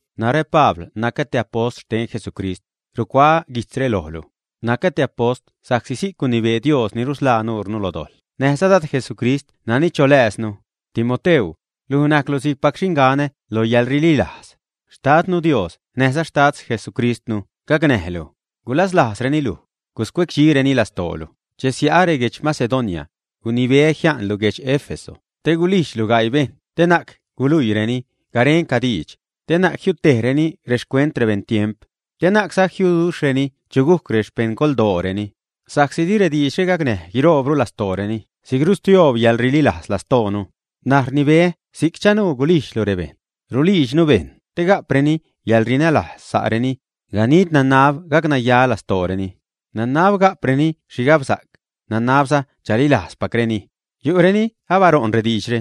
Narä Pabl, nacä te apost xten Jesucrist, rucuaä guijtzre lojlu. Nacä apost sa'csi si'c gunibee Dios ni rusḻaa nuurnu lo dojḻ näjza Dad Jesucrist nani cholääznu. Timoteu, luj najclu si'cpac xinganä lo yäḻrililajz. Xtadnu Dios näjza Xtad Jesucristnu gacnäjlu, gulaslajzreni luj, guscuecdxireni lastoolu. Che sia'ä reguedx Macedonia, gunibeä jia'nlu guedx Éfeso te gulijdxlu gaii bejṉ te na'c guluiireni garenca diidx, te na'c jiutejreni rexcuent rebeṉtiemp, te na'cza jiuduxhreni chu gujc rexpeṉgoldooreni, sa'csi di rediidxre gacnäj guiroobru lastooreni si'c rustioob yäḻrililajz lastoonu. N̲aj rnibeä si'c chanuu gulijdxlu rebejṉ. Rulijdxnu bejṉ te ga'preni yäḻrinälajz sa'reni. Ganid nanab gacnaya lastooreni, nanab ga'preni xhigabsa'c, nanabza chalilajzpacreni. Yu'reni abaṟo'n rediidxre,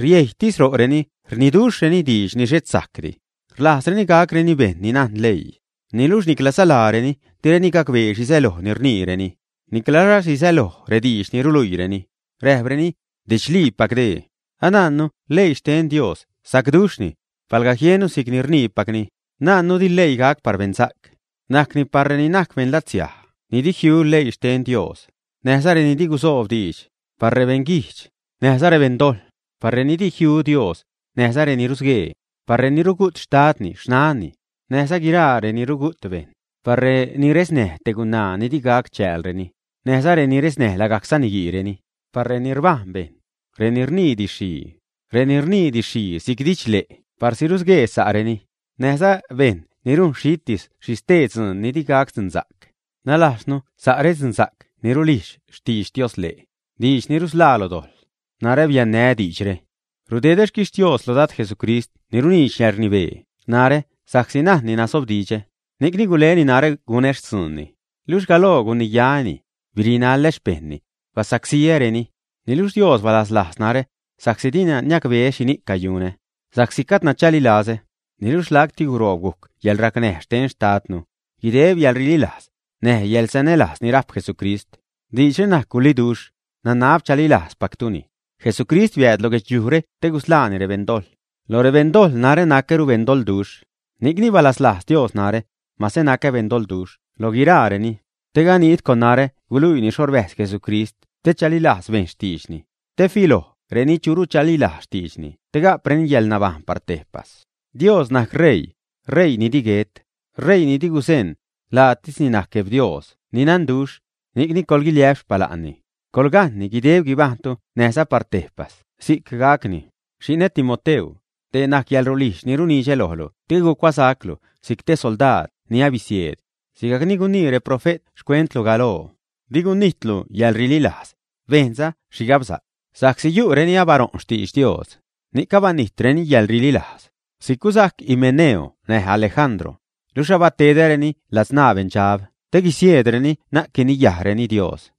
riejytis ro'reni saniduxhreni diidx ni xhet sajcdi. Rlajzreni gacreni bejṉ ni najn leii, niluxh niclaza laareni direni gacbee xhi säloj ni rniireni, niclaza xhi säloj rediidx ni ruluiireni, räjpreni, 'didxliipac dee'. Anajnnu leii xten Dios najc sacduxhni, palga jiennu si'cni rniipacni. Najnnu di leii gac par beṉsa'c, najcni par reni najc beṉlatsiaj ni di jiu leii xten Dios, näjza reni di gusoob diidx; par rebeṉ guijdx, näjza rebeṉdojḻ; par reni di jiu Dios, näjza reni rusguee; par reni rugu't xtadni, xnanni, näjza guiraa reni rugu't bejṉ; par reni resnäj te gunaa ni digac chäälreni, näjza reni resnäj lagajc saniguiireni; par reni rbajn bejṉ; reni rnii didx-xhii; reni rnii didx-xhii si'c didxle' parsi rusguee sa'reni; näjza bejṉ ni rujn xhitis xhi xtee dzuun ni digac dzunsa'c, nalajznu sa' redzunsa'c ni rulijdx xtidx Dios-le', diidx ni rusḻaa lo dojḻ. Narä biannää́ diidxre. Rdedä xquixtios lo Dad Jesucrist ni runiidx yäḻrnibee narä sa'csi najnni nasobdidxä, ni'cni guleni narä gunä xtzuunni. Luxh galoo guniyaä́ni, birinaḻä xpejṉni, basacsíäreni. Niluxh Dios balaslajz narä, sa'csi dina niacbeä xhini'c cayunä, sa'csi gajdna chalilazä. Niluxh lacti guroob gujc yäḻracnäj xte Xtadnu, guideb yäḻrililajz, näj yäḻsanälajz ni rajp Jesucrist. Diidxre najc guliduxh, nanab chalilajzpactuni: Jesucrist biääd lo guedxliujre te gusḻaani rebeṉ dojḻ; lo rebeṉ dojḻ narä nacäru beṉdoḻduxh. Ni'cni balaslajz Dios narä, mase nacä beṉdoḻduxh lo guiraareni, te ganid con narä guluiini xho rbäjz Jesucrist te chalilajz bejṉ xtiidxni, te filoj reni churu chalilajz xtiidxni te ga'preni yäḻnabajṉ par tejpas. Dios najc ṟeii, ṟeii ni di guet, ṟeii ni di guzeṉ, laatisni najc Gueb Dios ni nanduxh, ni'cni coḻguiliä'p xpala'nni, coḻgajṉni guideb guibajṉtu näjza par tejpas. Si'c gacni. Xi'nä, Timoteu, dee najc yäḻrulijdx ni runidxä lojlu te gucuasa'clu si'c te soldaad ni abisieed, sigajc ni gunii reprofe't xcuentlu galoo. Di gunijtlu yäḻrililajz, bejnza xhigabsa'c, sa'csi yu'reni abaṟo'n xtidx Dios, ni'c abanijtreni yäḻrililajz. Si'c gusajc Himeneo näj Alejandro, luxh abatedäreni ladzṉaa beṉdxab te guisieedreni na'c guiniya'reni Dios.